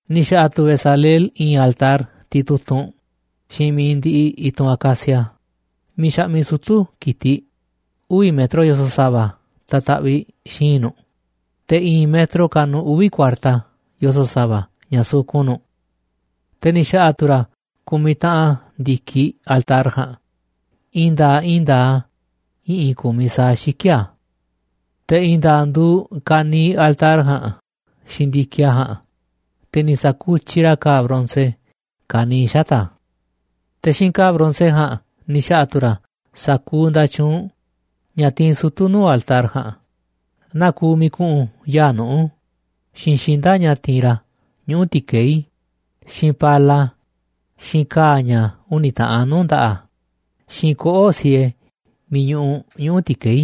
Ni̱ xa̱ꞌa̱ tu̱ Bezaleel i̱i̱n altar titutunꞌ xiinꞌ mi̱iꞌ ndiꞌiꞌ i̱tunꞌ acacia, miiꞌ xaꞌmiꞌ sutu̱ ki̱tiꞌ, uvi̱ metro yoso̱ꞌ sa̱va̱ ta̱taꞌviꞌ xi̱i̱nꞌ nu̱ꞌ, te̱ i̱i̱n metro kanuꞌ uvi̱ kuarta yoso̱ꞌ sa̱va̱ ña̱ sukun nu̱ꞌ. Te̱ ni̱ xa̱ꞌa̱ tu̱ ra̱ ku̱miꞌ taꞌan ndi̱kiꞌ altar ja̱a̱nꞌ, i̱i̱n nda̱a̱ꞌ i̱i̱n nda̱a̱ꞌ a̱ i̱ꞌi̱n ku̱miꞌ sa̱aꞌ xiki̱ꞌ a̱. Te̱ i̱i̱n nda̱a̱ꞌ nduuꞌ ka̱niiꞌ altar ja̱a̱nꞌ xiinꞌ ndi̱kiꞌ a̱ ja̱a̱nꞌ, te̱ ni̱ sa̱kutyiꞌ ra̱ ka̱a̱ bronce ka̱niiꞌ xata̱ꞌ a̱. Te̱ xiinꞌ ka̱a̱ bronce ja̱a̱nꞌ ni̱ xa̱ꞌa̱ tu̱ ra̱ sa̱kuuꞌ nda̱tyuunꞌ ña̱ tiinꞌ sutu̱ nuu̱ꞌ altar ja̱a̱nꞌ, naa kuuꞌ miiꞌ ku̱ꞌu̱n yaa̱ꞌ nuꞌu̱, xiinꞌ xinda̱ꞌ ña̱ ti̱i̱n ra̱ ñuꞌu̱ ti̱keí, xiinꞌ pala, xiinꞌ ka̱a̱ ña̱ uni̱ taꞌan nuu̱ꞌ nda̱ꞌaꞌ, xiinꞌ koꞌo̱ꞌ siee miiꞌ ñuꞌuꞌ ñuꞌu̱ ti̱keí.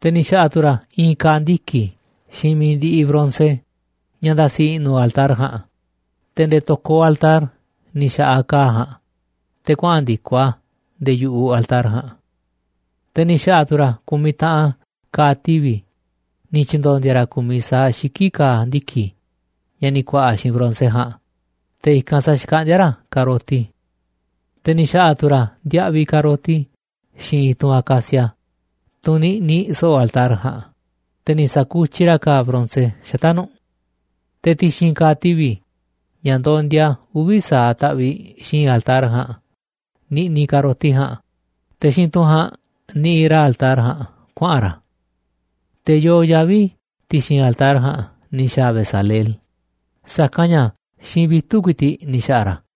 Te̱ ni̱ xa̱ꞌa̱ tu̱ ra̱ i̱i̱n ka̱a̱ ndiki̱ xiinꞌ mi̱iꞌ ndiꞌiꞌ bronce ña̱ nda̱si̱ i̱ꞌnu̱ altar ja̱a̱nꞌ, te̱ nde̱e̱ to̱koꞌ altar ni̱ xa̱ꞌaꞌ ka̱a̱ ja̱a̱nꞌ te̱ kuaꞌa̱n ndi̱koꞌ a̱ nde̱e̱ yu̱ꞌuꞌ altar ja̱a̱nꞌ. Te̱ ni̱ xa̱ꞌa̱ tu̱ ra̱ ku̱miꞌ taꞌan ka̱a̱ tivi̱ ni̱ tyi̱ndo̱ndi̱a̱ ra̱ ku̱miꞌ sa̱aꞌ xiki̱ꞌ ka̱a̱ ndiki̱ ña̱ ni̱ ku̱a̱ꞌa̱ xiinꞌ bronce ja̱a̱nꞌ, te̱ i̱kanꞌ sa̱xkaꞌndíá ra̱ ka̱roti. Te̱ ni̱ xa̱ꞌa̱ tu̱ ra̱ ndiaꞌviꞌ ka̱roti xiinꞌ i̱tunꞌ acacia, tunꞌ niꞌniꞌ so̱ꞌo̱ altar ja̱a̱nꞌ, te̱ ni̱ sa̱kutyiꞌ ra̱ ka̱a̱ bronce xata̱ꞌ nu̱ꞌ. Te̱ ti̱xi̱n ka̱a̱ tivi̱ ña̱ ndondia uvi̱ sa̱aꞌ taꞌviꞌ xi̱i̱nꞌ altar ja̱a̱nꞌ niꞌniꞌ ka̱roti ja̱a̱nꞌ, te̱ xiinꞌ tunꞌ ja̱a̱nꞌ niꞌiꞌ ra̱ altar ja̱a̱nꞌ kuaꞌa̱n ra̱. Te̱ yoo yavi̱ ti̱xi̱n altar ja̱a̱nꞌ ni̱ xa̱a̱ Bezaleel, sa̱kanꞌ ña̱ xiinꞌ vitu̱ꞌ ku̱i̱ti̱ꞌ ni̱ xa̱ꞌa̱ ra̱ a̱.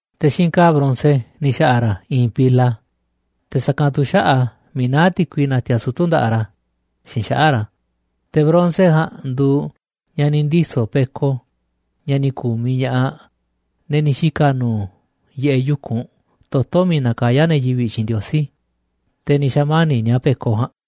Te̱ xiinꞌ ka̱a̱ bronce ni̱ xa̱ꞌa̱ ra̱ i̱i̱n pila, te̱ sa̱kanꞌ tu̱ xaꞌa̱ꞌ a̱ miiꞌ naá ti̱kui natiaꞌ sutu̱ nda̱ꞌaꞌ ra̱ xiinꞌ xaꞌa̱ꞌ ra̱, te̱ bronce ja̱a̱nꞌ nduuꞌ ña̱ ni̱ ndiso̱ peko ña̱ ni̱ ku̱miꞌ ña̱ꞌaꞌ, ne̱ ni̱ xika̱ nu̱u̱ yiꞌeꞌ yu̱kunꞌ toto̱ miiꞌ nakayá ne̱ yivi̱ꞌ xiinꞌ Ndiosí, te̱ ni̱ xa̱mani̱ꞌ ni̱a̱ peko ja̱a̱nꞌ.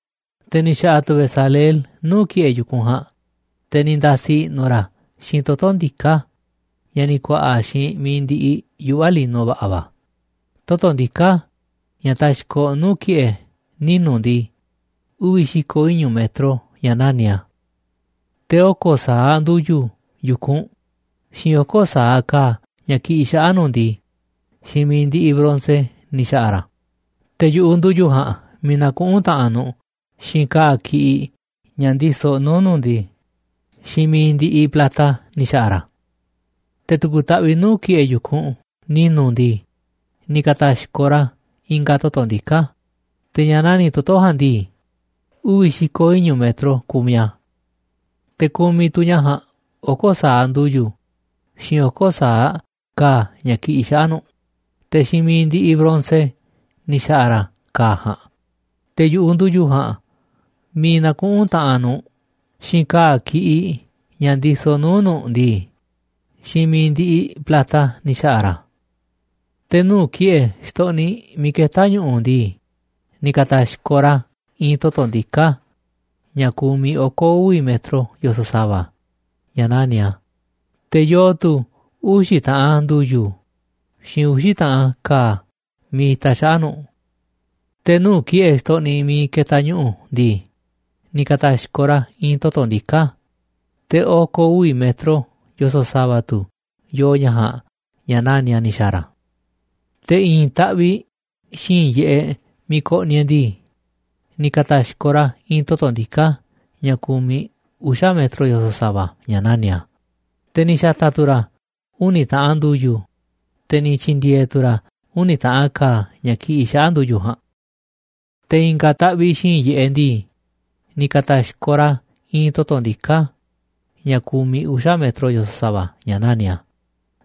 Te̱ ni̱ xa̱ꞌa̱ tu̱ Bezaleel nuu̱ꞌ ki̱ꞌe̱ yu̱kunꞌ ja̱a̱nꞌ, te̱ ni̱ nda̱si̱ i̱ꞌnu̱ ra̱ a̱ xiinꞌ toto̱ ndiká ña̱ ni̱ ku̱a̱ꞌa̱ xiinꞌ mi̱iꞌ ndiꞌiꞌ yuꞌva̱ lino va̱ꞌa̱ va̱. Toto̱ ndiká ña̱ taxkoꞌ nuu̱ꞌ ki̱ꞌe̱ ninu̱ ndii, uvi̱ xi̱ko̱ iñu̱ metro ña̱ nani̱ꞌ a̱. Te̱ oko̱ sa̱aꞌ ndu̱yu̱ yu̱kunꞌ, xiinꞌ oko̱ sa̱aꞌ ka̱a̱ ña̱ kiꞌiꞌ xaꞌa̱ꞌ nu̱ꞌ ndii, xiinꞌ mi̱iꞌ ndiꞌiꞌ bronce ni̱ xa̱ꞌa̱ ra̱ a̱, te̱ yu̱ꞌuꞌ ndu̱yu̱ ja̱a̱nꞌ miiꞌ nakuꞌún taꞌanꞌ nu̱ꞌ xiinꞌ ka̱a̱ ki̱ꞌiꞌ ña̱ ndisoꞌ nuu̱ꞌ nu̱ꞌ ndii, xiinꞌ mi̱iꞌ ndiꞌiꞌ plata ni̱ xa̱ꞌa̱ ra̱ a̱. Te̱ tu̱ku̱ taꞌviꞌ nuu̱ꞌ ki̱ꞌe̱ yu̱kunꞌ ni̱nu̱ ndii, ni̱ ka̱ta̱xkoꞌ ra̱ i̱nga̱ toto̱ ndiká, te̱ ña̱ nani̱ꞌ toto̱ ja̱a̱nꞌ ndii, uvi̱ xi̱ko̱ iñu̱ metro kumiꞌ a̱. Te̱ kumiꞌ tu̱ ña̱ ja̱a̱nꞌ oko̱ sa̱aꞌ ndu̱yu̱, xiinꞌ oko̱ sa̱aꞌ ka̱a̱ ña̱ kiꞌiꞌ xaꞌa̱ꞌ nu̱ꞌ, te̱ xiinꞌ mi̱iꞌ ndiꞌiꞌ bronce ni̱ xa̱ꞌa̱ ra̱ ka̱a̱ ja̱a̱nꞌ, te̱ yu̱ꞌuꞌ ndu̱yu̱ ja̱a̱nꞌ miiꞌ nakuꞌún taꞌanꞌ nu̱ꞌ xiinꞌ ka̱a̱ ki̱ꞌiꞌ ña̱ ndisoꞌ nuu̱ꞌ nu̱ꞌ ndii, xiinꞌ mi̱iꞌ ndiꞌiꞌ plata ni̱ xa̱ꞌa̱ ra̱ a̱. Te̱ nuu̱ꞌ ki̱ꞌe̱ xtoꞌniꞌ miiꞌ ketá ñu̱ꞌu̱ ndii, ni̱ ka̱ta̱xkoꞌ ra̱ i̱i̱n toto̱ ndiká ña̱ kumiꞌ oko̱ uvi̱ metro yoso̱ꞌ sa̱va̱ ña̱ nani̱ꞌ a̱, te̱ yoo tu̱ uxi̱ taꞌan ndu̱yu̱ xiinꞌ uxi̱ taꞌan ka̱a̱ miiꞌ itaꞌ xaꞌa̱ꞌ nu̱ꞌ. Te̱ nuu̱ꞌ ki̱ꞌe̱ xtoꞌniꞌ miiꞌ ketaꞌ ñu̱ꞌu̱ ndii, ni̱ ka̱ta̱xkoꞌ ra̱ i̱i̱n toto̱ ndiká, te̱ oko̱ uvi̱ metro yoso̱ꞌ sa̱va̱ tu̱ yoo ña̱ ja̱a̱nꞌ ña̱ nani̱ꞌ a̱ ni̱ xa̱a̱ ra̱. Te̱ i̱i̱n taꞌviꞌ xi̱i̱nꞌ yiꞌeꞌ miiꞌ koꞌniꞌ e̱ꞌ ndii, ni̱ ka̱ta̱xkoꞌ ra̱ i̱i̱n toto̱ ndiká ña̱ ku̱miꞌ uxa̱ metro yoso̱ꞌ sa̱va̱ ña̱ nani̱ꞌ a̱, te̱ ni̱ xa̱ta̱ tu̱ ra̱ uni̱ taꞌan ndu̱yu̱, te̱ ni̱ tyi̱ndi̱e̱e̱ tu̱ ra̱ uni̱ taꞌan ka̱a̱ ña̱ ki̱ꞌi̱ xaꞌa̱ꞌ ndu̱yu̱ ja̱a̱nꞌ. Te̱ i̱nga̱ taꞌviꞌ xi̱i̱nꞌ yiꞌeꞌ ndii, ni̱ ka̱ta̱xkoꞌ ra̱ i̱i̱n toto̱ ndiká ña̱ ku̱miꞌ uxa̱ metro yoso̱ꞌ sa̱va̱ ña̱ nani̱ꞌ a̱,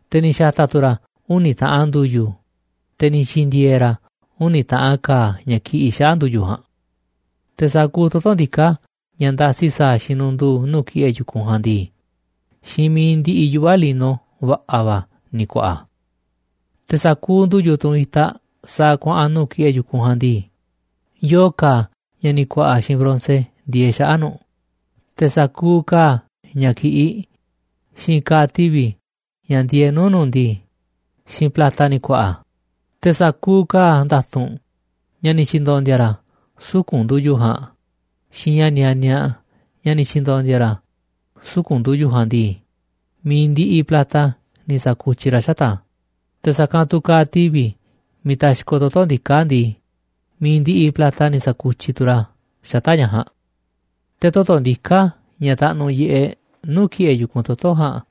te̱ ni̱ xa̱ta̱ tu̱ ra̱ uni̱ taꞌan ndu̱yu̱, te̱ ni̱ tyi̱ndi̱e̱e̱ ra̱ uni̱ taꞌan ka̱a̱ ña̱ ki̱ꞌi̱ xaꞌa̱ꞌ ndu̱yu̱ ja̱a̱nꞌ. Te̱ sa̱kuuꞌ toto̱ ndiká ña̱ ndasi sa̱a̱ xinundu̱u̱ nuu̱ꞌ ki̱ꞌe̱ yu̱kunꞌ ja̱a̱nꞌ ndii, xiinꞌ mi̱iꞌ ndiꞌiꞌ yuꞌva̱ lino va̱ꞌa̱ va̱ ni̱ ku̱a̱ꞌa̱ a̱. Te̱ sa̱kuuꞌ ndu̱yu̱, tunꞌ itaꞌ sa̱a̱ kuaꞌa̱n nuu̱ꞌ ki̱ꞌe̱ yu̱kunꞌ ja̱a̱nꞌ ndii, yoo ka̱a̱ ña̱ ni̱ ku̱a̱ꞌa̱ xiinꞌ bronce ndieeꞌ xaꞌa̱ꞌ nu̱ꞌ, te̱ sa̱kuuꞌ ka̱a̱ ña̱ ki̱ꞌiꞌ xiinꞌ ka̱a̱ tivi̱ ña̱ ndieeꞌ nuu̱ꞌ nu̱ꞌ ndii, xiinꞌ plata ni̱ ku̱a̱ꞌa̱ a̱. Te̱ sa̱kuuꞌ ka̱a̱ nda̱tu̱nꞌ ña̱ ni̱ tyi̱ndo̱ndi̱a̱ ra̱ suku̱nꞌ ndu̱yu̱ ja̱a̱nꞌ xiinꞌ ña̱ nianiaꞌ ña̱ ni̱ tyi̱ndo̱ndi̱a̱ ra̱ suku̱nꞌ ndu̱yu̱ ja̱a̱nꞌ ndii, mi̱iꞌ ndiꞌiꞌ plata ni̱ sa̱kutyiꞌ ra̱ xata̱ꞌ a̱, te̱ sa̱kanꞌ tu̱ ka̱a̱ tivi̱ miiꞌ taxkoꞌ toto̱ ndiká ndii, mi̱iꞌ ndiꞌiꞌ plata ni̱ saku̱tyiꞌ tu ra̱ xata̱ꞌ ña̱ ja̱a̱nꞌ. Te̱ toto̱ ndiká ña̱ taꞌnuꞌ yiꞌeꞌ nuu̱ꞌ ki̱ꞌe̱ yu̱kunꞌ toto̱ ja̱a̱nꞌ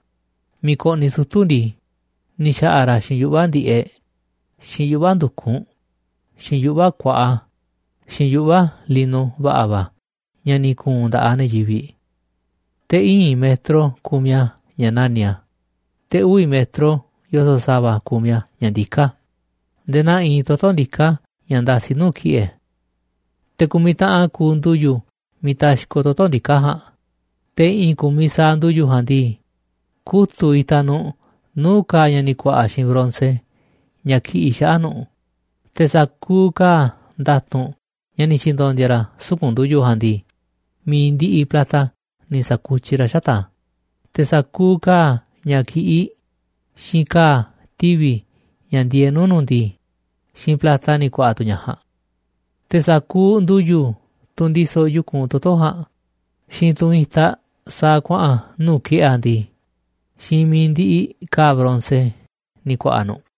miiꞌ koꞌniꞌ sutu̱ ndii, ni̱ xa̱ꞌa̱ ra̱ xiinꞌ yuꞌva̱ ndi̱ꞌeꞌ, xiinꞌ yuꞌva̱ ndu̱kunꞌ, xiinꞌ yuꞌva̱ kuaꞌa, xiinꞌ yuꞌva̱ lino va̱ꞌa̱ va̱ ña̱ ni̱ ku̱u̱n nda̱ꞌaꞌ ne̱ yivi̱ꞌ. Te̱ íin metro kumiꞌ a̱ ña̱ nani̱ꞌ a̱, te̱ uvi̱ metro yoso̱ꞌ sa̱va̱ kumiꞌ a̱ ña̱ ndiká a̱ nde̱e̱ naa iinꞌ toto̱ ndiká ña̱ ndasi nuu̱ꞌ ki̱ꞌe̱. Te̱ ku̱miꞌ taꞌan kuuꞌ ndu̱yu̱ miiꞌ taxkoꞌ toto̱ ndiká ja̱a̱nꞌ, te̱ i̱ꞌi̱n ku̱miꞌ sa̱aꞌ ndu̱yu̱ ja̱a̱nꞌ ndii, kutu̱ꞌ itaꞌ nu̱ꞌ nuu̱ꞌ ka̱a̱ ña̱ ni̱ ku̱a̱ꞌa̱ xiinꞌ bronce ña̱ kiꞌiꞌ xaꞌa̱ꞌ nu̱ꞌ, te̱ sa̱kuuꞌ ka̱a̱ nda̱tu̱nꞌ ña̱ ni̱ tyi̱ndo̱ndi̱a̱ ra̱ suku̱nꞌ ndu̱yu̱ ja̱a̱nꞌ ndii, mi̱iꞌ ndiꞌiꞌ plata ni̱ sa̱kutyiꞌ ra̱ xata̱ꞌ a̱, te̱ sa̱kuuꞌ ka̱a̱ ña̱ ki̱ꞌiꞌ xiinꞌ ka̱a̱ tivi̱ ña̱ ndieeꞌ nuu̱ꞌ nu̱ꞌ ndii, xiinꞌ plata ni̱ ku̱a̱ꞌa̱ tu̱ ña̱ ja̱a̱nꞌ. Te̱ sa̱kuuꞌ ndu̱yu̱, tunꞌ ndisoꞌ yu̱kunꞌ toto̱ ja̱a̱nꞌ xiinꞌ tunꞌ itaꞌ sa̱a̱ kuaꞌa̱n nuu̱ꞌ ki̱ꞌe̱ a̱ ndii, xiinꞌ mi̱iꞌ ndiꞌiꞌ ka̱a̱ bronce ni̱ ku̱a̱ꞌa̱ nu̱ꞌ.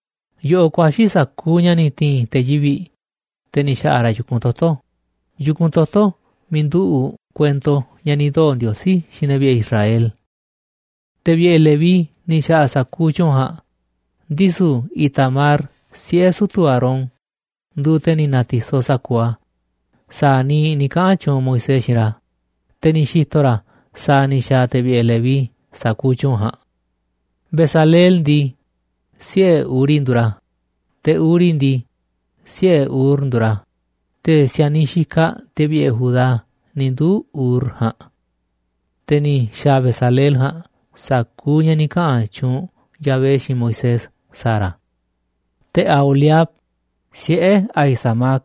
Yoꞌoꞌ ku̱a̱xi̱ sa̱ku̱u̱ ña̱ ni̱ ti̱i̱n te̱ yivi̱ꞌ, te̱ ni̱ xa̱ꞌa̱ ra̱ yu̱kunꞌ toto̱, yu̱kunꞌ toto̱ miiꞌ nduꞌu̱ꞌ kuento ña̱ ni̱ ndoo̱ Ndiosí xiinꞌ ne̱ vi̱ꞌe̱ Israel. Te̱ vi̱ꞌe̱ Leví ni̱ xa̱ꞌa̱ sa̱kuuꞌ tyu̱u̱n ja̱a̱nꞌ, ndisu̱ Itamar, siꞌe̱ sutu̱ Aarón, nduuꞌ te̱ ni̱ na̱ti̱soꞌ sa̱kuuꞌ a̱ sa̱a̱ niiꞌ ni̱ kaꞌa̱n tyuunꞌ Moisés xiinꞌ ra̱, te̱ ni̱ xi̱to̱ ra̱ sa̱a̱ ni̱ xa̱a̱ te̱ vi̱ꞌe̱ Leví sa̱kuuꞌ tyu̱u̱n ja̱a̱nꞌ. Bezaleel ndii, siꞌe̱ Uri nduuꞌ ra̱, te̱ Uri ndii, siꞌe̱ Ur nduuꞌ ra̱, te̱ si̱a̱niꞌ xikaꞌ te̱ vi̱ꞌe̱ Judá ni̱ nduu̱ Ur ja̱a̱nꞌ. Te̱ ni̱ xa̱a̱ Bezaleel ja̱a̱nꞌ sa̱kuuꞌ ña̱ ni̱ kaꞌa̱n tyuunꞌ Yahvé xiinꞌ Moisés sa̱a̱ ra̱. Te̱ Aholiab, siꞌe̱ Ahisamac,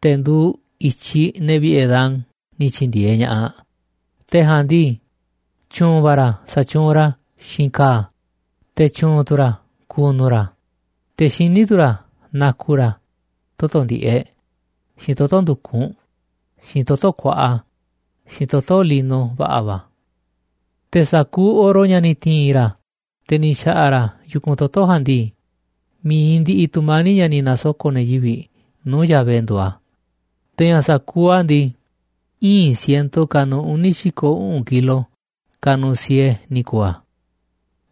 te̱ nduuꞌ i̱tyiꞌ ne̱ vi̱ꞌe̱ Dan, ni̱ tyi̱ndi̱e̱eꞌ ña̱ꞌaꞌ. Te̱ ja̱a̱nꞌ ndii, tyu̱u̱n va̱ ra̱ sa̱tyuunꞌ ra̱ xiinꞌ ka̱a̱, te̱ tyu̱u̱n tu̱ ra̱ ku̱nu̱ ra̱, te̱ xiní tu̱ ra̱ na̱ku̱ ra̱ toto̱ ndi̱ꞌeꞌ, xiinꞌ toto̱ ndu̱kunꞌ, xiinꞌ toto̱ kuaꞌa, xiinꞌ toto̱ lino va̱ꞌa̱ va̱. Te̱ sa̱kuuꞌ oro ña̱ ni̱ ti̱i̱n ra̱, te̱ ni̱ xa̱ꞌa̱ ra̱ yu̱kunꞌ toto̱ ja̱a̱nꞌ ndii, mi̱iꞌ ndiꞌiꞌ tu̱mani̱ꞌ ña̱ ni̱ na̱soko̱ꞌ ne̱ yivi̱ꞌ nuu̱ꞌ Yahvé nduuꞌ a̱, te̱ ña̱ sa̱kuuꞌ a̱ ndii, íin siento kanuꞌ uni̱ xi̱ko̱ uꞌu̱n kilo kanuꞌ siee ni̱ ku̱u̱ a̱.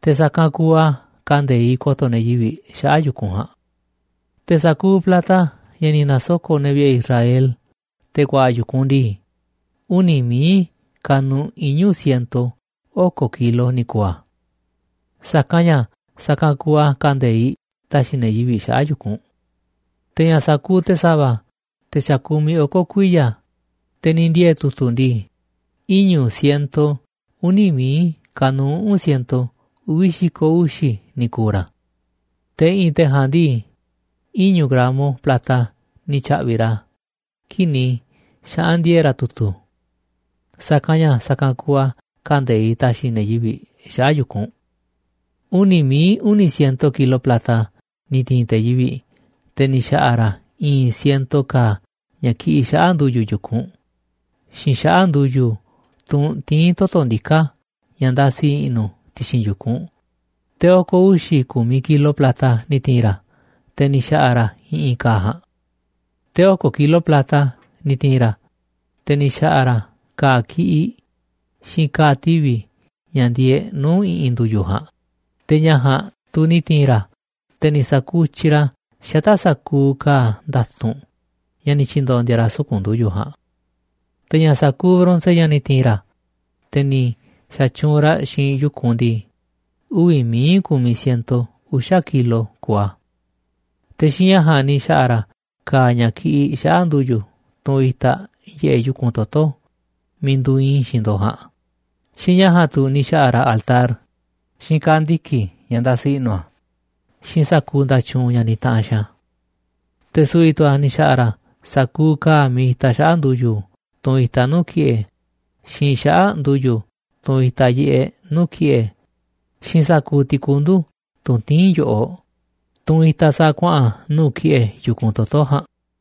Te̱ sa̱kanꞌ kuuꞌ a̱ kande̱iꞌ ko̱to̱ ne̱ yivi̱ꞌ xaꞌa̱ꞌ yu̱kunꞌ ja̱a̱nꞌ. Te̱ sa̱kuuꞌ plata ña̱ ni̱ na̱soko̱ꞌ ne̱ vi̱ꞌe̱ Israel te̱ ku̱a̱ꞌa̱ yu̱kunꞌ ndii, uni̱ mi̱iꞌ kanuꞌ iñu̱ siento oko̱ kilo ni̱ ku̱u̱ a̱. Sa̱kanꞌ ña̱ sa̱kanꞌ kuuꞌ a̱ kande̱iꞌ ta̱xi̱ ne̱ yivi̱ꞌ xaꞌa̱ꞌ yu̱kunꞌ. Te̱ ña̱ sa̱kuuꞌ te̱ sa̱va̱, te̱ xa̱ kumiꞌ oko̱ kuiya̱ te̱ ni̱ ndiee̱ tu̱tu̱ ndii, iñu̱ siento uni̱ mií kanuꞌ uꞌu̱n siento uvi̱ xi̱ko̱ uxi̱ ni̱ ku̱u̱ ra̱. Te̱ i̱ꞌi̱n te̱ ja̱a̱nꞌ ndii, iñu̱ gramo plata ni̱ tya̱ꞌvi̱ ra̱ kii̱ꞌ ni̱ xaꞌa̱n ndiee̱ ra̱ tu̱tu̱. Sa̱kanꞌ ña̱ sa̱kanꞌ kuuꞌ a̱ kande̱iꞌ ta̱xi̱ ne̱ yivi̱ꞌ xaꞌa̱ꞌ yu̱kunꞌ. Uni̱ mií uni̱ siento kilo plata ni̱ ti̱i̱n te̱ yivi̱ꞌ, te̱ ni̱ xa̱ꞌa̱ ra̱ i̱i̱n siento ka̱a̱ ña̱ kiꞌiꞌ xaꞌa̱ꞌ ndu̱yu̱ yu̱kunꞌ xiinꞌ xaꞌa̱ꞌ ndu̱yu̱, tunꞌ tiín toto̱ ndiká ña̱ ndasi i̱ꞌnu̱ ti̱xi̱n yu̱kunꞌ, te̱ oko̱ uxi̱ ku̱miꞌ kilo plata ni̱ ti̱i̱n ra̱, te̱ ni̱ xa̱ꞌa̱ ra̱ i̱ꞌi̱n ka̱a̱ ja̱a̱nꞌ. Te̱ oko̱ kilo plata ni̱ ti̱i̱n ra̱, te̱ ni̱ xa̱ꞌa̱ ra̱ ka̱a̱ ki̱ꞌiꞌ xiinꞌ ka̱a̱ tivi̱ ña̱ ndieeꞌ nuu̱ꞌ i̱ꞌi̱n ndu̱yu̱ ja̱a̱nꞌ, te̱ ña̱ ja̱a̱nꞌ tu̱ ni̱ ti̱i̱n ra̱, te̱ ni̱ sa̱kutyiꞌ ra̱ xata̱ꞌ sa̱kuuꞌ ka̱a̱ nda̱tu̱nꞌ ña̱ ni̱ tyi̱ndo̱ndi̱a̱ ra̱ suku̱nꞌ ndu̱yu̱ ja̱a̱nꞌ. Te̱ ña̱ sa̱kuuꞌ bronce ña̱ ni̱ ti̱i̱n ra̱, te̱ ni̱ xa̱tyuunꞌ ra̱ xiinꞌ yu̱kunꞌ ndii, uvi̱ mií ku̱miꞌ siento uxa̱ kilo kuuꞌ a̱. Te̱ xiinꞌ ña̱ ja̱a̱nꞌ ni̱ xa̱ꞌa̱ ra̱ ka̱a̱ ña̱ kiꞌiꞌ xaꞌa̱ꞌ ndu̱yu̱, tunꞌ itaꞌ yiꞌeꞌ yu̱kunꞌ toto̱ miiꞌ nduuꞌ iinꞌ i̱ xiinꞌ ndo̱ꞌ ja̱a̱nꞌ, xiinꞌ ña̱ ja̱a̱nꞌ tu̱ ni̱ xa̱ꞌa̱ ra̱ altar, xiinꞌ ka̱a̱ ndiki̱ ña̱ ndasi i̱ꞌnu̱ a̱, xiinꞌ sa̱kuuꞌ nda̱tyuunꞌ ña̱ nitaꞌanꞌ xiinꞌ a̱. Te̱ su̱vi̱ tu̱ a̱ ni̱ xa̱ꞌa̱ ra̱ sa̱kuuꞌ ka̱a̱ miiꞌ itaꞌ xaꞌa̱ꞌ ndu̱yu̱, tunꞌ itaꞌ nuu̱ꞌ ki̱ꞌe̱, xiinꞌ xaꞌa̱ꞌ ndu̱yu̱, tunꞌ itaꞌ yiꞌeꞌ nuu̱ꞌ ki̱ꞌe̱, xiinꞌ sa̱kuuꞌ ti̱kundu̱, tunꞌ tiín yo̱ꞌoꞌ, tunꞌ itaꞌ sa̱a̱ kuaꞌa̱n nuu̱ꞌ ki̱ꞌe̱ yu̱kunꞌ toto̱ ja̱a̱nꞌ.